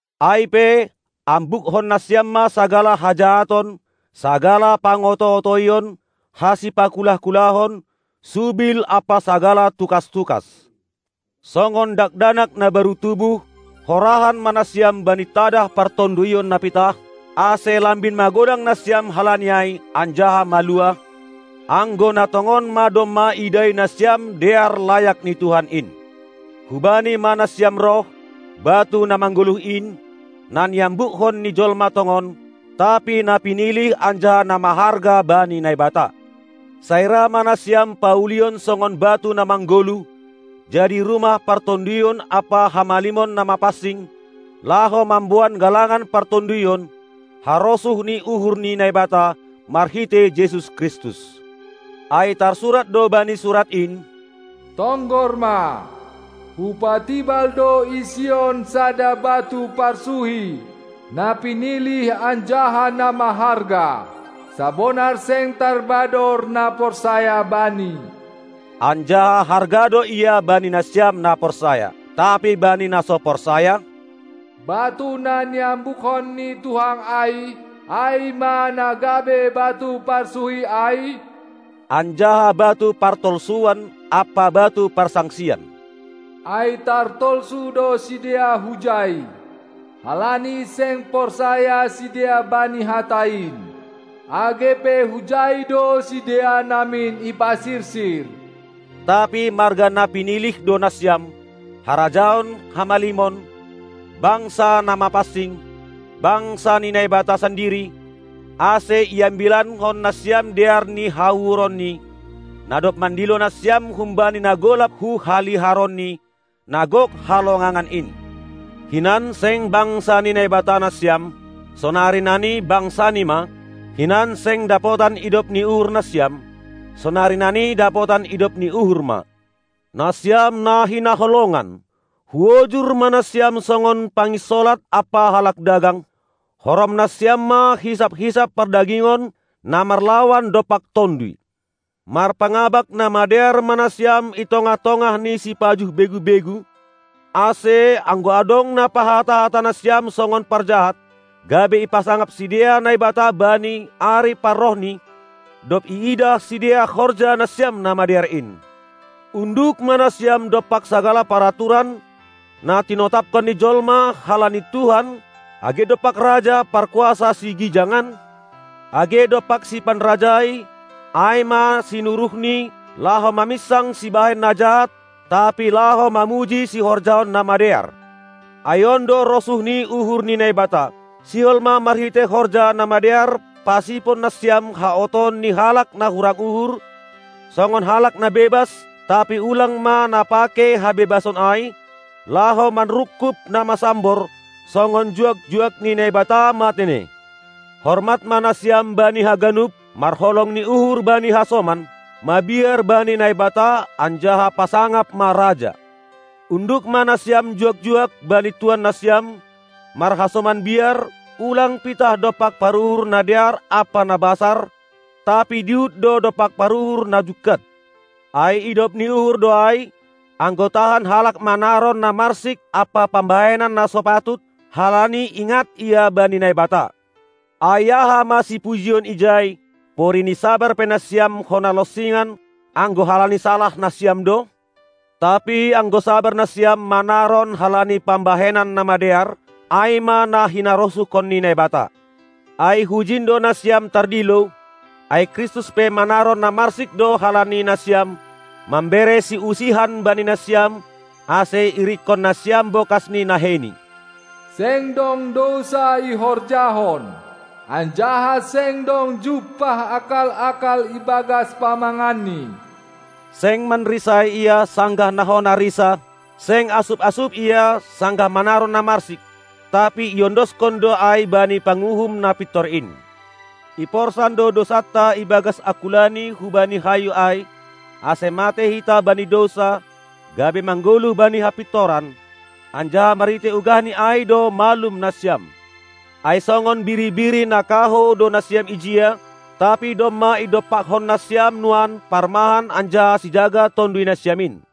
Ai pe, ambukkon nasiam ma sagala hajahaton, sagala pangoto-otoion, hasipakulah-kulahon, subil ampa sagala tukas-tukas. Songon dakdanak na baru tubuh, horahan ma nasiam bani tadah partonduyon na pitah, ase lambin magodang nasiam halani ai anjaha maluah, anggo na tongon ma domma idai nasiam dear layak ni Tuhan in. Hubani ma nasiam roh, batu na manggoluh in, na niambukkon ni jolma tongon, tapi na pinilih anjaha na maharga bani Naibata. Sai ra ma nasiam paulion songon batu na manggoluh, jadi rumah partonduyon ampa hamalimon na mapansing, laho mamboan galangan partonduyon, harosuh ni uhur ni Naibata, marhitei Jesus Kristus. Ai tarsurat do bani Surat in: Tonggor ma, hupatibal do i Sion sada batu parsuhi na pinilih anjaha na maharga; sabonar seng tarbador na porsaya Bani. Anjaha harga do Ia bani nasiam na porsaya. Tapi bani na so porsaya: Batu na niambukkon ni tuhang ai, ai ma na gabe batu parsuhi ai, anjaha batu partolsuan ampa batu parsangsian. Ai tartolsu do sidea hujai, halani seng porsaya sidea bani hata in, age pe hujai do sidea namin ipasirsir. Tapi marga na pinilih do nasiam, harajaon hamalimon, bangsakna mapansing, bangsa ni Naibata sandiri, ase iambilankon nasiam dear ni hauhuronNi, na dob mandilo nasiam humbani na golap hu haliharonNi, na gok halongangan in. Hinan seng bangsa ni Naibata nasiam, sonari nani bangsaNi ma; hinan seng dapotan idop ni uhur nasiam, sonari nani dapotan idop ni uhur ma. Nasiam na hinaholongan, huojur ma nasiam songon panginsolat ampa halak dagang: Horom nasiam ma hisap-hisap pardagingon, na marlawan dompak tonduy. Marpangabak na madear ma nasiam i tongah-tongah ni sipajuh begu-begu, ase, anggo adong na pahata-hata nasiam songon parjahat, gabe ipasangap sidea Naibata bani ari parrohNi, dob iidah sidea horja nasiam na madear in. Unduk ma nasiam dompak sagala paraturan, na tinotapkon ni jolma, halani Tuhan, age dompak raja, parkuasa sigijangan, age dompak sipanrajai, ai ma sinuruhNi, laho maminsang sibahen na jahat, tapi laho mamuji sihorjahon na madear. Ai on do rosuh ni uhur ni Naibata: Sihol ma marhitei horja na madear pasipon nasiam haotoon ni halak na hurang uhur, songon halak na bebas, tapi ulang ma na pakei habebason ai, laho manrungkub na masambor; songon juak-juak ni Naibata ma tene. Hormat ma nasiam bani haganup, marholong ni uhur bani hasoman, mabiar bani Naibata anjaha pasangap ma raja. Unduk ma nasiam juak-juak bani tuan nasiam, marhasoman biar; ulang pitah dompak paruhur na dear ampa na basar, tapi dihut do dompak paruhur na jungkat. Ai idop ni uhur do ai, anggo tahan halak manaron na marsik ampa pambahenan na so patut, halani ingat ia bani Naibata. Ai aha ma sipujion ijai, porini sabar pe nasiam hona lonsingan anggo halani salah nasiam do? Tapi anggo sabar nasiam manaron halani pambahenan na madear, ai ma na hinarosuhkon ni Naibata. Ai hujin do nasian tardilo, ai Kristus pe manaron na marsik do halani nasiam, mambere siusihan bani nasiam, ase iirikkon nasiam bokas ni naheiNi. Seng dong dousa ihorjahon, anjaha seng dong jumpah akal-akal ibagas pamanganNi. Seng manrisai Ia, sanggah na hona risa; seng asup-asup Ia, sanggah manaron na marsik; tapi iondoskon do ai bani Panguhum na pintor in. Iporsan do dousanta ibagas angkulaNi hubani hayu ai, ase matei hita bani dousa, gabe manggoluh bani hapintoran. Anjaha marhitei ugahNi ai do malum nasiam. Ai songon biri-biri na kahou do nasiam ijia, tapi domma idompakkon nasiam nuan Parmahan anjaha Sijaga tonduy nasiam in.